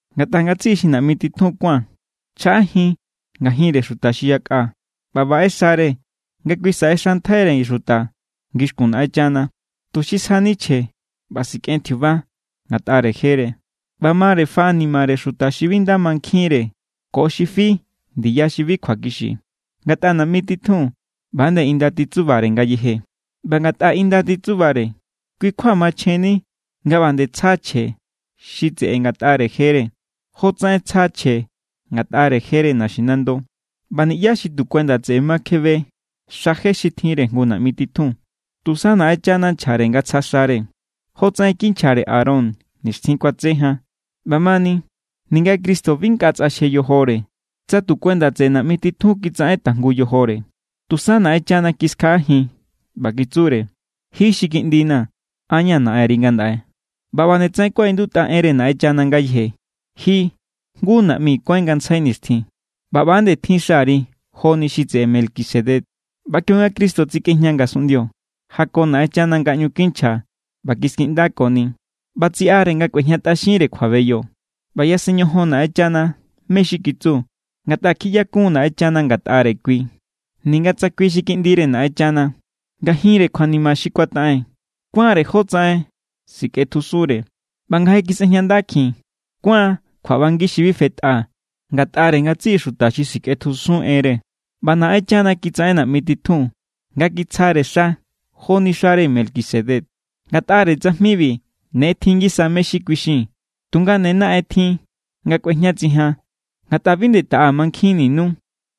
Ngatꞌa ngatsiꞌi xi naꞌmi titjun kuán chjaꞌajin ngajinre xuta xi yakꞌa ꞌba baꞌe xare nga kui saꞌexantjaire xuta ngixkun Naꞌenchana, tuxi sjani chje ꞌba sikꞌen tjiuba ngatꞌare jere. ꞌBa mare faꞌanimare xuta xi bi nda mankjinre ko xi fi ndiya xi bi kjuakixi, ngatꞌa naꞌmi titjun, ꞌba=nde inda titsubare ngayeje. ꞌBa ngatꞌa inda titsubare, kui= kjua machjenni nga ꞌba nde tsja chje xi tseꞌe ngatꞌare jere, jotsaꞌen tsja chje ngatꞌare jere naxinando. ꞌBa niꞌyá xi tu kuenda tseꞌe ma kjebe xa je xi tjinre jngu naꞌmi titjun. Tusa Naꞌenchana nchjare nga tsja xare, jotsaꞌen kinchjare Aarón nixtjin kuatse jan. ꞌBamani, ninga Cristo bi nkꞌa tsꞌaxje yojore, tsa tu kuenda tseꞌe naꞌmi titjun kitsaꞌen tajngu yojore. Tusa Naꞌenchana kiskjaꞌajin ꞌba kitsure: Ji xi Kiꞌndina̱, an= ña̱ Naꞌenri ngandaꞌe. ꞌBa ꞌba nde tsaꞌen kuaꞌindutꞌa enre Naꞌenchana ngayeje: Ji jngu naꞌmi kuáin ngantsjai nixtjin. ꞌBa ꞌba nde tjin xari joni xi tseꞌe Melquisedec. ꞌBa kionga Cristo tsikꞌejña ngasunꞌndio, jako Naꞌenchana nga ꞌñu kinchja ꞌba kiskiꞌndakoni, ꞌba tsiꞌare nga kꞌuejñatꞌaxinre kjuabeyo. ꞌBa yasen ñojon Naꞌenchana mé= xi kitsu, ngatꞌa kjiꞌyakun Naꞌenchana ngatꞌare kui. Ninga tsa kui xi Kiꞌndire Naꞌenchana, ngajinre kjuanima xi kuataꞌen kuánre jotsaꞌen sikꞌetjusunre. ꞌBa nga je kisꞌejñandakjin, kuán kjuaꞌbangi xi bi fetꞌa ngatꞌare ngatsiꞌi xuta xi sikꞌetjusun enre. ꞌBa Naꞌenchana kitsaꞌen naꞌmi titjun nga kitsjare xa joni xare Melquisedec. Ngatꞌare tsajmibi ne tjin ngisa mé= xi kuixii̱n. Tunga ne naꞌen tjin nga kꞌuejñatsijian, ngatꞌa bi nde taꞌa mankjinninu.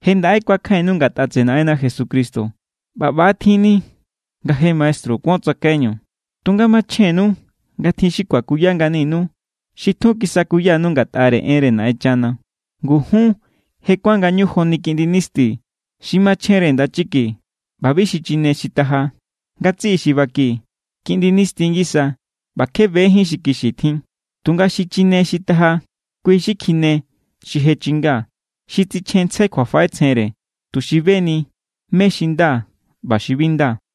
Je ndaꞌe kuakjainnu ngatꞌa tseꞌe Naꞌenna Jesucristo ꞌba ꞌba= tjinni nga je maestru kuon tsakaiñu, tunga machjennu nga tjin xi kuakuya nganinu xi tjun kisakuyanu ngatꞌare enre Naꞌenchana. Ngu jun je kuán ngañu joni kiꞌndi nisti xi machjenre ndachiki, ꞌba bi xichine xi taja. Ngatsiꞌi xi baki, kiꞌndi nisti ngisa ꞌba kje bejín xi kixi tjin. Tunga xichine xi taja, kui xi kjine xi je chinga, xi tsichjenntsjai kjuafaꞌetsjenre, tuxi beni mé= xi nda ꞌba xi bi nda.